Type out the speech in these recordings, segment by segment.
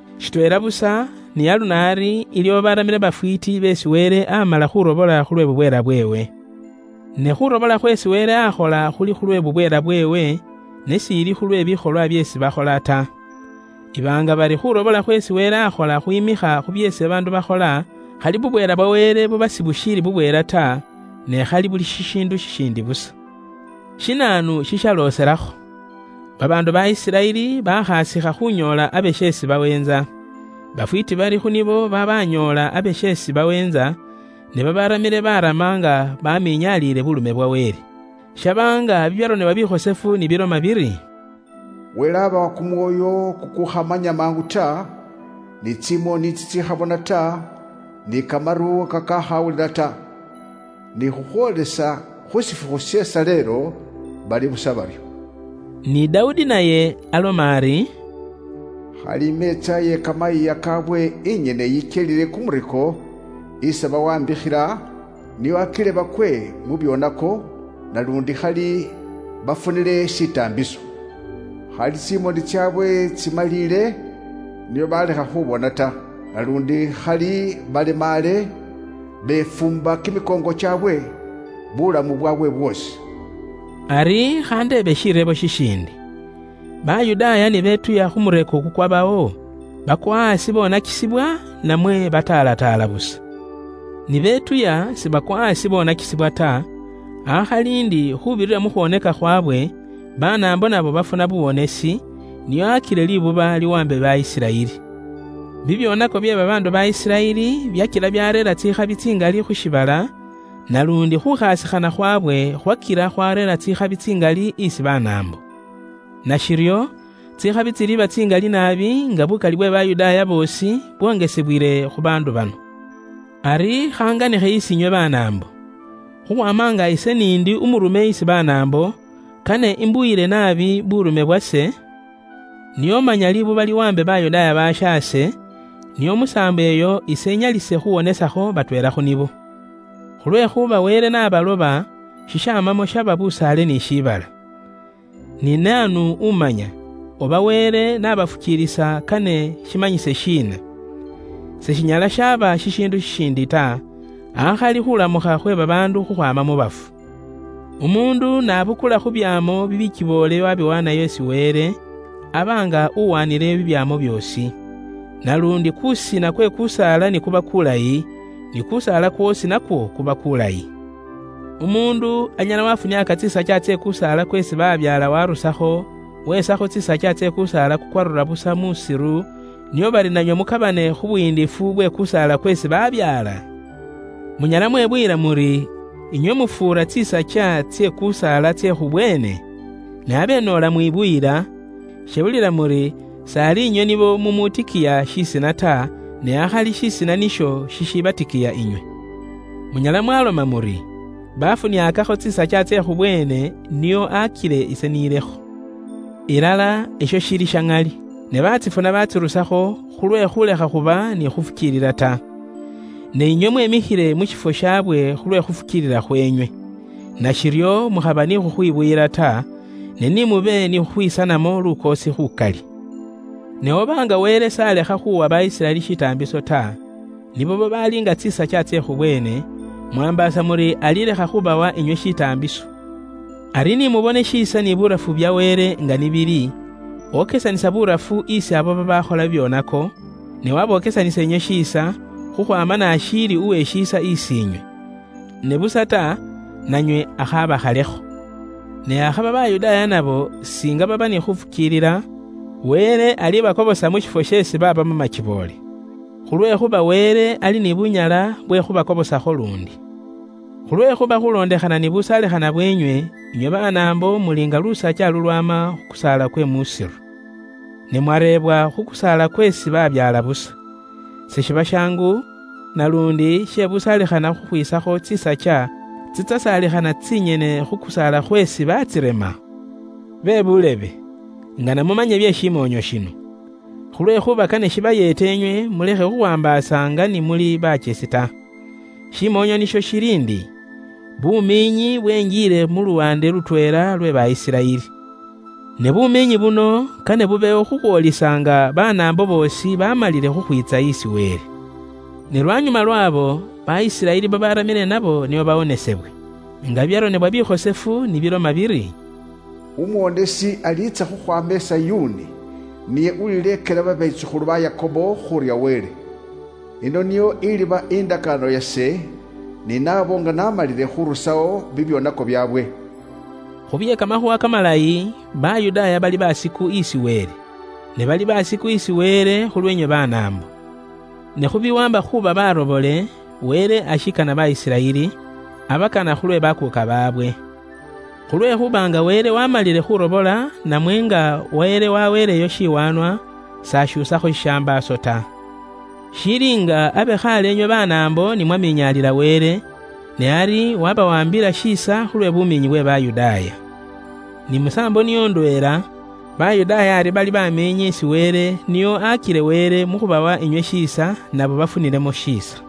Shitweela busa, ni aluno ari iliwo babaramile bafwiiti beesi Wele amala khurobola khulwe bubweela bweewe. Ne khurobola khweesi Wele akhola khuli khulwe bubweela bweewe, ne s'ili khulwe bikholwa byeesi bakhola ta. Iba nga bari khurobola khweesi Wele akhola khwimikha khu byeesi babaandu bakhola, khali bubweela bwa Wele buba sibushiili bubweela ta, ne khali buli shishiindu shishindi busa. Shinaanu shishalooselakho? Babaandu ba Isiraeli bakhasikha khunyoola abe sheesi baweentsa. Bafwiti bari khu nibo babanyoola abe sheesi baweentsa, ne babaramile barama nga baminyaliile buurume bwa Wele. Shaba nga bibyaronebwa bikhosefu ni biloma biri, “Wele aabawa kumwoyo kukukhamanya mangu ta, ni tsimoni tsitsikhabona ta, ni kamaru kakaakhawulila ta. Ni khukhwoolisa khu shifukhu she shaleelo, bali busa baryo.” Ni Dawudi naye aloma ari, “Khali imeetsa iye kamayiiya kaabwe inyene yikyelile kumureko isi bawaambikhila, nio akile bakwe mu byoonako, naluundi khali bafunile shitaambiso! Khali tsimoni tsaabwe tsimaliile nio balekha khubona ta, naluundi khali balemaale befuumba kimikoongo kyaabwe buulamu bwaabwe bwoosi.” Ari khandeebe shireebo shishiindi: Bayudaaya ni betuya khu mureeko kukwabawo, baakwa aasi boonakisibwa, namwe baataalataala busa? Ni betuya sibakwa aasi boonakisibwa ta, akhali indi khuubirira mu khwooneka khwaabwe, Banaambo nabo baafuna buuwonesi, nio akile liibuba liwaambe ba Isiraeli. Bibyoonako bye babaandu ba Isiraeli byakila byaareera tsikhabi tsingali khu shiibala, naluundi khuukhasikhana khwaabwe khwakila khwareera tsikhabi tsingali isi Banaambo. Nashiryo, tsikhabi tsiliba tsingali naabi nga buukali bwe Bayudaaya boosi bwongesebwile khu baandu bano. Ari khanganikhe isi inywe Banaambo. Khukhwaama nga ise n'indi umurume isi Banaambo, kane imbuyile naabi buurume bwase, nio manya liibuba liwaambe babaandu babaali Bayudaaya bashaase, nio musaambo iyo ise inyalise khuwonesakho batweela khu nibo. Khulwekhuuba Wele n'abaloba nibo, shishamamo shaba busaale ni shiibala. Ne naanu umanya, oba Wele n'abafukiilisa nibo kane shimanyise shiina? Seshinyala shaaba shishiindu shishiindi ta, akhali khuulamukha khwe babaandu khukhwaama mu bafu. Umuundu n'abukula khu byaamo bikiboole waabiwaanayo nga bikhosefu isi Wele, aba nga uwaanileyo bibyaamo byoosi. Naluundi kuusina kwe kusaala ni kuba kukhosefu, ni kusaala kwoosi nakwo kuba kulayi. Umuundu anyala wafuniaaka tsisakya tsye kusaala kweesi balyakho bibyaamo warusakho, wesakho tsisakya tsye kusaala kwe muusiru busa, nio bari nanywe mukabane khu buyiindifu bwe kusaala kweesi balyakho bibyaamo? Munyala mwebuyila muri inywe mufuura tsisakya tsye kusaala tsye khubweene? Ne abe noola mwibuyila, shebulila muri s'ali inywe nibo mumutikiya shisina ta, ne akhali shisina nisho shishibatikiya inywe. Munyala mwaloma muri, “Baafuniaakakho tsisakya tsye khubweene nio akile ise nilekho.” Ilala, isho shili sha ŋali. Ne baatsifuna batsirusakho khulwe khulekha khuba ni khufukiilila ta. Ne inywe mwemikhile mu shifwo shabwe khulwe khufukiilila khweenywe. Nashiryo mukhaba ni khukhwibuyila ta, ne ni mube ni khukhwisanamo lukoosi khukali. Ne oba nga Wele s'alekha khuuwa ba Isiraeli shitaambiso ta, nibo babaali nga tsisakya tsye khubweene, mwaambaasa muri alilekha khubawa inywe shitaambiso. Ari ni mubone shiisa ni burafu bya Wele nga ni bili; okesanisa burafu isi abo babaakhola bibyoonako, ne wabokesanisa inywe shiisa, khukhwaama n'ashiili uwe shiisa isi inywe. Ne busa ta, nanywe akhaabakhalekho. Ne akhaba Bayudaaya nabo singa baba ni khufukiilila, Wele alibakobosa mu shifwo sheesi baabamo makiboole. Khulwekhuuba Wele ali ni bunyala bwe khubakobosakho luundi. Khulwekhuuba khulondekhana ni busaalikhana bwenywe, inywe Banaambo muli nga lusakya lulwaama khu kusaala kwe muusiru. Ne mwareebwa khu kusaala kweesi balyakho bibyaamo. Seshiba shaangu, naluundi she busaalikhana khukhwiisakho tsisakya tsisaalikhana tsinyene khu kusaala khweesi batsirema? Bebuulebe, ingana mumanye bye shimoonyo shino. Khulwekhuuba kane shibayeete inywe mulekhe khukhwaambaasa nga ni muli bakyesi ta. Shimoonyo nisho shili indi: bumiinyi bwengiile mu luwaande lutweela lwe ba Isiraeli. Ne bumiinyi buno kane bubewo khukhwoolisa nga Banaambo boosi bamalile khukhwiitsa isi Wele. Ne lwanyuma lwabo, ba Isiraeli babaramile nabo nio bawonesebwe. Nga bibyaronebwa bikhosefu ni biloma biri, “Umuwonesi aliitsa khukhwaama i Sayuuni. Niye ulileekela babetsukhulu ba Yakobo khurya Wele. Iyino niyo iliba indakaano yase ni nabo nga naamalile khuurusawo bibyoonako byaabwe.” Khu bye Kamakhuuwa Kamalayi, Bayudaaya bali baasiku isi Wele. Ne bali baasiku isi Wele khulweenywe Banaambo. Ne khu biwaamba khuuba barobole, Wele ashiikana ba Isiraeli; abakana khulwe bakuuka baabwe. Khulwekhuuba nga Wele waamalile khurobola namwe nga Wele waweeleyo shiwaanwa, s'ashuusakho shishambaaso ta. Shili nga abe khaale inywe Banaambo ni mwaminyaalila Wele, ne ari wabawaambila shiisa khulwe bumiinyi bwe Bayudaaya. Ni musaambo niyo ndweela, Bayudaaya ari bali bamiinyi isi Wele nio akile Wele mu khubawa inywe shiisa, nabo bafunilemo shiisa.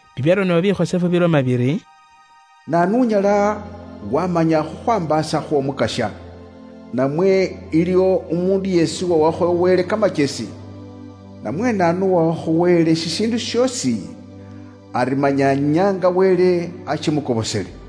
Bibyaronebwa bikhosefu biloma biri, “Naanu unyala wamanya khukhwaambaasa khw'Omukasya? Namwe iliwo umuundu yeesi uwawakho Wele kamakyesi? Namwe naanu uwawakho Wele shishiindu shoosi, ari manya nyaanga Wele ashimukobosele?”